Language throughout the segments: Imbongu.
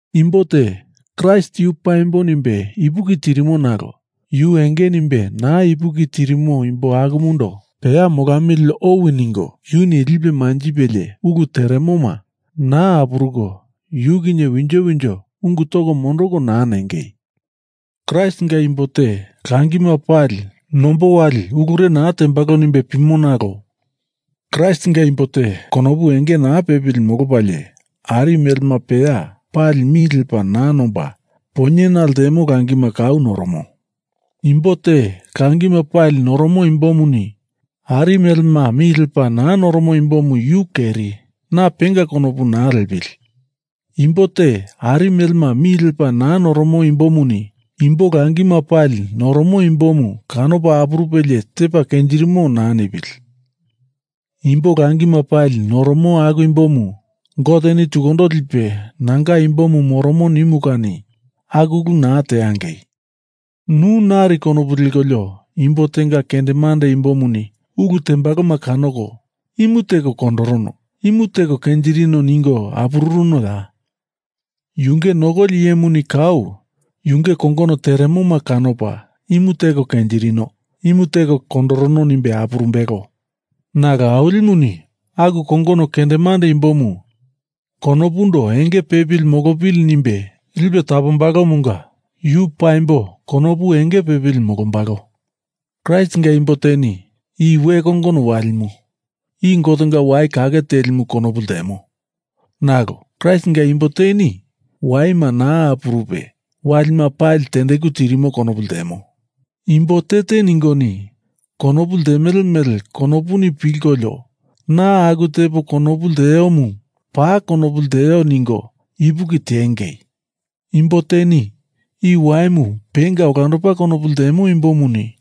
Imbo te Kraist yu paimbo nimbe ipuki tirimo nalo yu enge nimbe naa ipuki tirimo imbo akumundo peya molamili owi ningo, yuni lipe manjipelie ulu teremoma naa apuruko yu kinye winjo winjo ungu toko mondoko naa nengei. Kraistinga imbo te langima pali nombo wali ulure naa tembalo nimbe pimo nalo Kraistinga imbo te konopu enge naa pepili molopalie ari melema peya pali mi lepa naa nomba, poinyena ltemo langima kau noromo. Imbo te langima pali noromo imbomuni ari melema mi lepa naa noromo imbomu yu keri, na penga konopu naa liepili. Imbo te ari melema mi lepa naa noromo imbomuni imbo langima pali noromo imbomu kanopa apurupelie tepa kenjirimo naa nipili. Imbo langima pali noromo aku imbomu Goteni tukundo lipe nanga imbomu moromo nimu kani aku ulu naa teangei. Nu nari konopu lekolio imbo tenga kendemande imbomuni ulu tembaloma kanoko imu teko kondorono, imu teko kenjirino ningo apururunoya? Yunge nokoli iyemuni kau yunge kongono teremoma kanopa imu teko kenjirino, imu teko kondorono nimbe apurumbelo. Nalo Awilimuni aku kongono kendemande imbomu konopundo enge pepili molopili nimbe lipe tapombalomunga yu paimbo konopu enge pepili molombalo. Kraistinga imbo teni i we kongono walimu, i Gotenga wai kake telimu konopu ltemo. Nalo Kraistinga imbo teni waima naa apurupe walima pali tendeku tirimo konopu ltemo. Imbo te te ningoni konopu ltemele mele konopuni pilkolio na aku tepo konopu lteomu paa konopu lteo ningo ipuki tiengei! Imbo teni i waimu penga olandopa konopu ltemo imbomuni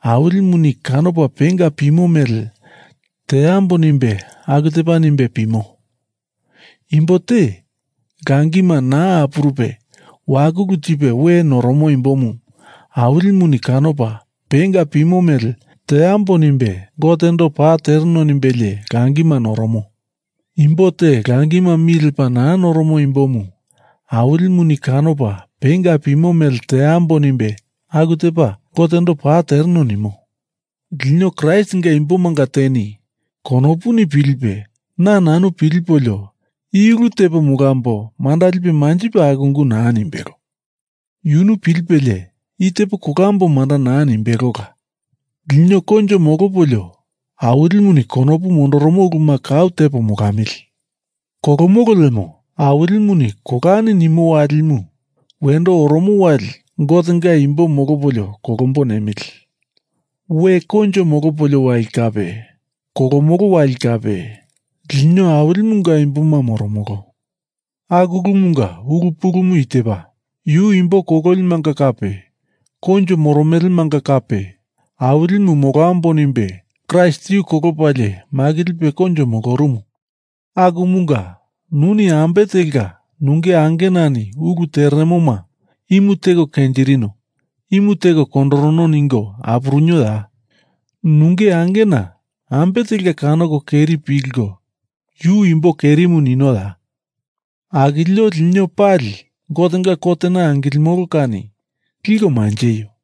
Awilimuni kanopa penga pimo mele teambo nimbe aku tepa nimbe pimo. Imbo te langima naa apurupe wakulu tipe we noromo imbomu Awilimuni kanopa penga pimo mele teambo nimbe Gotendo paa tereno nimbelie langima noromo. Imbo te langima mi lepa naa noromo imbomu Awilimuni kanopa penga pimo mele teambo nimbe aku tepa Gotendo paa tereno nimo. Lino Kraistinga imbomanga teni konopuni pilipe na nanu pilipolio i ulu tepo molambo manda lipe manjipe aku ungu naa nimbelo. Yunu pilipelie i tepo kolambo manda naa nimbelola. Lino koinjo molopolio Awilimuni kondopu mondoromo uluma kau tepo molamili. Kolomolo lemo Awilimuni kolani nimo walimu wendo oromo wali Gotenga imbo molopolio kolombo nemili. We koinjo molopolio wali kape kolomolo wali kape lino Awilimunga imboma moromolo. Aku ulumunga ulu pulumu i tepa: Yu imbo kololimanga kape koinjo moromelemanga kape Awilimu molambo nimbe Kraist yu kolopalie makilipe koinjo molorumu. Akumunga nuni ambe telka nunge angenani ulu teremoma imu teko kenjirino, imu teko kondorono ningo apururunoya? Nunge angena ambe telka kanoko keri pilko yu imbo kerimu ninoya? Akilio lino pali Gotenga kotena angilimolo kani liko manjeio.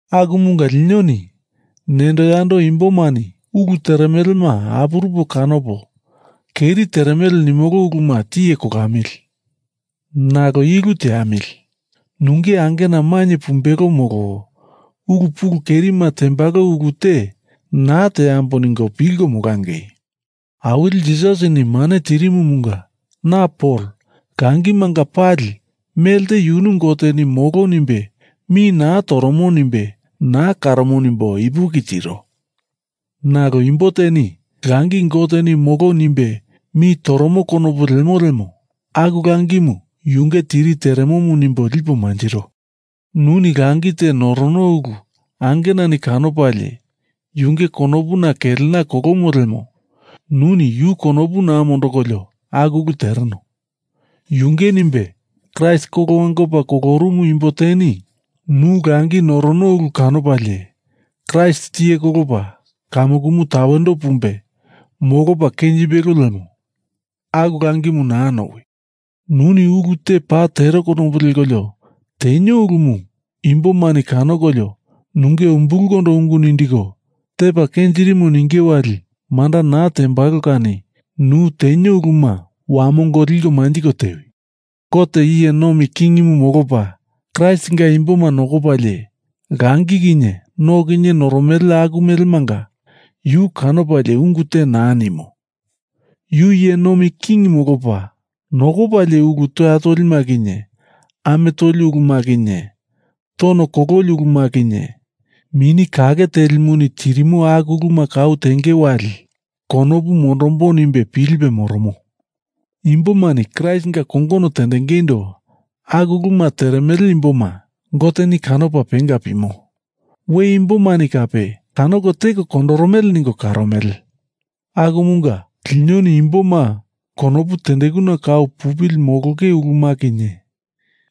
Akumunga linoni nendo yando imbomani ulu teremelema apurupo kanopo keri teremele nimolo uluma tiye kolamili. Nalo i ulu teamili, nunge angena mainye pumbelo molo ulu pulu kerima tembalo ulu te naa teambo ningo pilko molangei. Awili Jisasini mane tirimumunga na Pol, langimanga pali melte yunu Goteni molo nimbe mi naa toromo nimbe naa karomo nimbo ipuki tiro. Nalo imbo teni langi Goteni molo nimbe mi toromo konopu lemo lemo aku langimu yunge tiri teremomu nimbo lipo manjiro. Nuni langi te norono ulu angenani kanopalie yunge konopuna kelena kolomo lemo nuni yu konopu naa mondokolio aku ulu tereno. Yunge nimbe Kraist kolo wangopa kolorumu imbo teni nu langi norono ulu kanopalie Kraist tiye kolopa kamukumu tawendo pumbe molopa kenjimbelo lemo aku langimu naa nowi! Nuni ulu te paa tero konopu lekolio tenio ulumu imbomani kanokolio nunge umbulkondo ungu nindiko tepa kenjirimo ninge wali manda naa tembalo kani nu tenio uluma wamongo liko manjiko tewi. Gote iye nomi king molopa Kraistinga imboma nokopalie langi kinye no kinye noromele aku melemanga yu kanopalie ungu te naa nimo. Yu iye nomi king molopa nokopalie ulu toya tolima kinye, ame toli uluma kinye, tono kololi uluma kinye, Mini Kake Telimuni tirimo aku uluma kau tenge wali konopu mondombo nimbe pilipe moromo. Imbomani Kraistinga kongono tendengeindo aku uluma teremele imboma Goteni kanopa penga pimo, we imbomani kape kanoko teko kondoromele ningo karomele. Akumunga linoni imboma konopu tendekuna kau pupili molonge uluma kinye,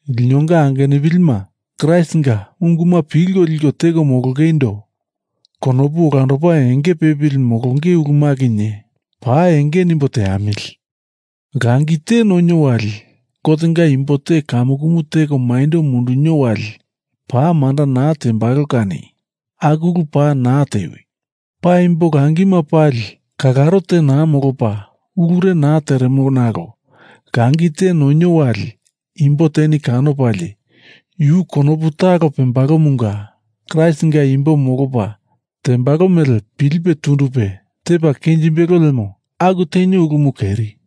linonga angenupilima Kraistinga unguma pilko liko teko molongeindo konopu olandopa enge pepili molonge uluma kinye, paa enge nimbo teamili. Langi te nonio wali Gotenga imbo te kamukumu teko maindo mundunio wali paa manda naa tembalo kani aku ulu paa naa tewi. Paimbo langima pali kalaro te naa molopa ulure naa teremo nalo langi te nonio wali imbo teni kanopalie yu konopu talo pembalomunga Kraistinga imbo molopa tembalo mele pilipe tundupe tepa kenjimbelo lemo aku tenio ulumu keri.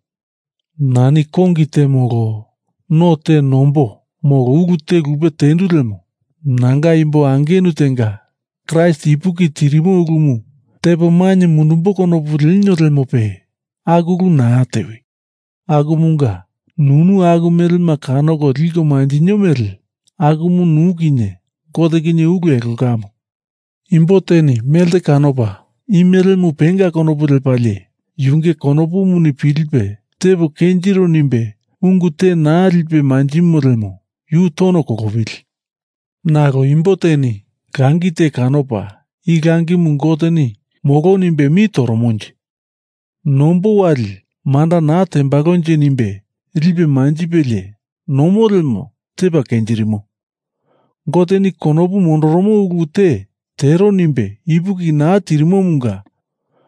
Nani kongi te molo no te nombo molo ulu te lupe tendu lemo nanga imbo angenu tenga Kraist ipuki tirimo ulumu tepo mainye mundumbo konopu lenio lemope aku ulu naa tewi. Akumunga nunu aku melema kanoko liko manjinio mele akumu nu kinye Gote kinye ulu elongamu. Imbo teni melte kanopa i melemu penga konopu lepalie yunge konopuni pilipe tepo kenjiro nimbe ungu te naa lipe manjimo lemo yu tono kolopili. Nalo imbo teni langi te kanopa i langimu Goteni molo nimbe mi toromonje. nombo wali manda naa tembalonje nimbe lipe manjipelie nomo lemo tepa kenjirimo. Goteni konopu mondoromo ulu te tero nimbe ipuki naa tirimomunga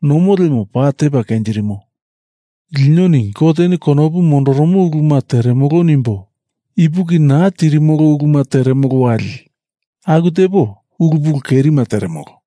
nomo lemo paa tepa kenjirimo. Linoni Goteni konopu mondoromo uluma teremolo nimbo ipuki naa tirimolo uluma teremolo wali aku tepo ulu pulu kerima teremolo.